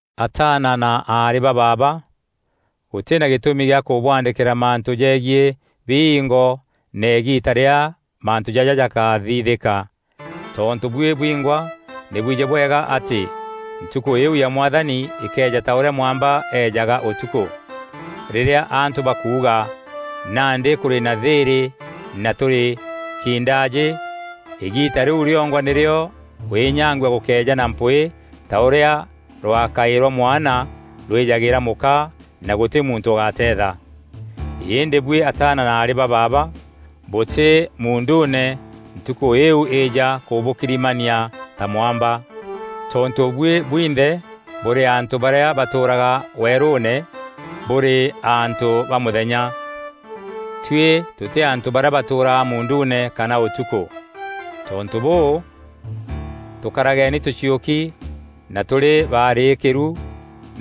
Ataana na aarî ba baaba, gûtî na gîtûmi gîa kûbwandîkîra mantû jegiî biingo na îgiita rîrîa mantû jaja jakathithîka. Tontû buî bwingwa nî bwijî bwega atî ntukû îîu ya Mwathani îkeeja ta ûrîa mwamba eejaga ûtukû. Rîrîa antû bakuuga, “Nandî kûrî na thîîrî na tûrî kindaajî.” Îgiita rîu rîongwa nîrîo kwînyangua gûkeeja na mpwîî ta ûrîa rwakaî rwa mwana rwîjagîîra mûka, na gûtî muntû ûgateetha. Îndî buî ataana na aarî ba baaba, bûtî muunduune ntukû îîu îîja kûbûkirimania ta mwamba. Tontû buî bwinthe bûrî antû barîa batûûraga weerûûne, bûrî antû ba mûthenya. Tuî tûtî antû barîa batûûraga muunduune kana ûtukû. Tontû bûû, tûkarageni tûciûki na tûrî barîîkîru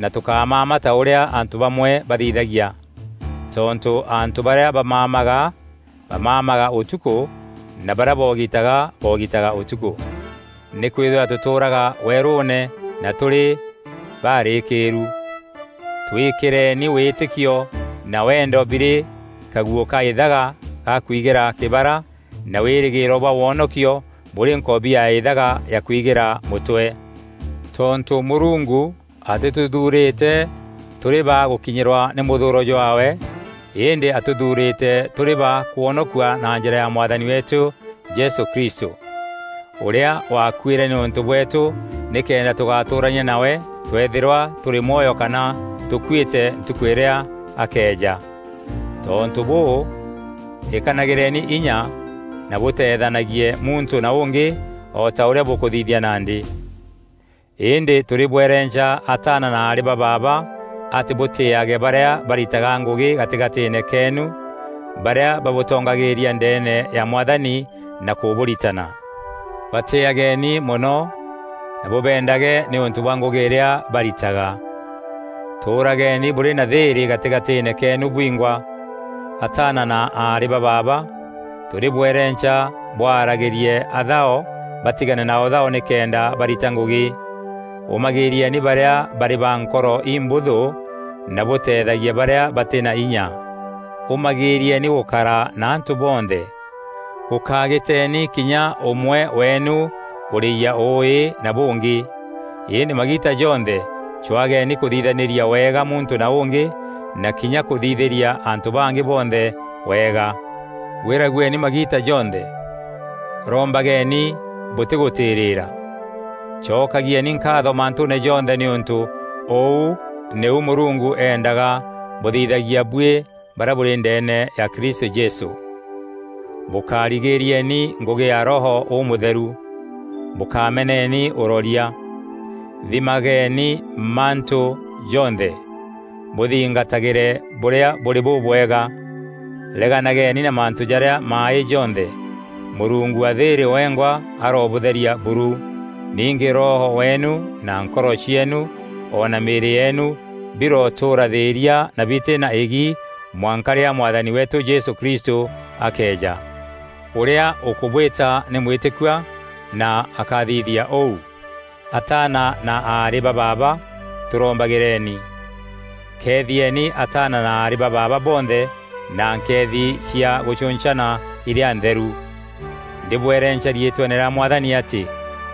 na tûkámama ta ûrîa antû bamwe bathithagia. Tontû antû barîa bamamaga, bamamaga ûtukû na barîa bogitaga, bogitaga ûtukû. Nîkwîthîrwa tûtûraga werûûne na tûrî barîîkîru, twîkîreni wîtîkio na wendo birî kaguû ka îthaga ga kwigîra kîbara na wîrîgîîro bwa wonokio bûrî nkobia ya îthaga ya kwigîra mûtwe. Tontû Mûrungu atîtûthuurîte tûrî ba gûkinyîrwa nî mûthûûro jwaawe, îndî atûthuurîte tûrî ba kwonokua na njîra ya Mwathani weetû Jesû Kristû, ûrîa wakuîre nîûntû bweetû nîkenda tûgatûûrania nawe tweethîrwa tûrî mwoyo kana tûkuîte ntukû îrîa akeeja. Tontû bûû, îkanagîreni inya na bûteethanagie muntû na ûngî, o ta ûrîa bûkûthithia nandî. Îndî tûrîbwerenca ataana na aarî ba baaba, atî bûtîîage barîa baritaga ngûgî gatîgatîîne keenu, barîa babûtongagîîria ndeene ya Mwathani na kûbûritana. Batîageni mono na bûbendage nîûntû bwa ngûgî irîa baritaga. Tûûrageni bûrî na thîîrî gatîgatîîne keenu bwingwa. Ataana na aarî ba baaba, tûrîbwerenca bwaragîrie athao batigane na ûthao nîkenda barita ngûgî. Ûmagîîrieni barîa barî ba nkoro imbûthû na bûteethagie barîa batî na inya. Ûmagîîrieni gûkara na antû bonthe. Gûkagîteni kinya ûmwe weenu ûrîyia ûûî na bûngî, îndî magiita jonthe cwaageni kûthithanîria wega muntû na ûngî na kinya kûthithîria antû bangî bonthe wega. Gwîragueni magiita jonthe. Rombageni bûtîgûtîrîîra. Cokagîeni nkaatho mantûûne jonthe nîûntû ûu nîu Mûrungu endaga bûthithagia buî barîa bûrî ndeene ya Kristû Jesû. Bûkarigîrieni ngûgî ya Roho Ûmûtheru. Bûkameneni ûroria. Thimageni mantû jonthe, bûthingatagîre bûrîa bûrî bûbwega. Reganageni na mantû jarîa maaî jonthe. Mûrungu wa thîîrî wengwa arobûtheria buru. Ningî roho weenu na nkoro cieenu o na mîîrî yeenu birotûûra thîîria na bitî na îgi mwanka rîrîa Mwathani weetû Jesû Kristû akeeja. Ûrîa ûkûbwîta nî mwîtîkua na akathithia ûu. Ataana na aarî ba baaba, tûrombagîreni. Keethieni ataana na aarî ba baaba bonthe na nkeethi cia gûcûncana irîa ntheru. Ndîbwerenca riîtweene rîa Mwathani atî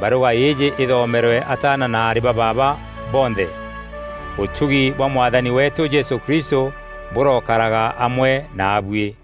barûga îîjî îthomerwe ataana na aarî ba baaba bonthe. Ûtugi bwa Mwathani weetû Jesû Kristû bûrokaraga amwe naabuî.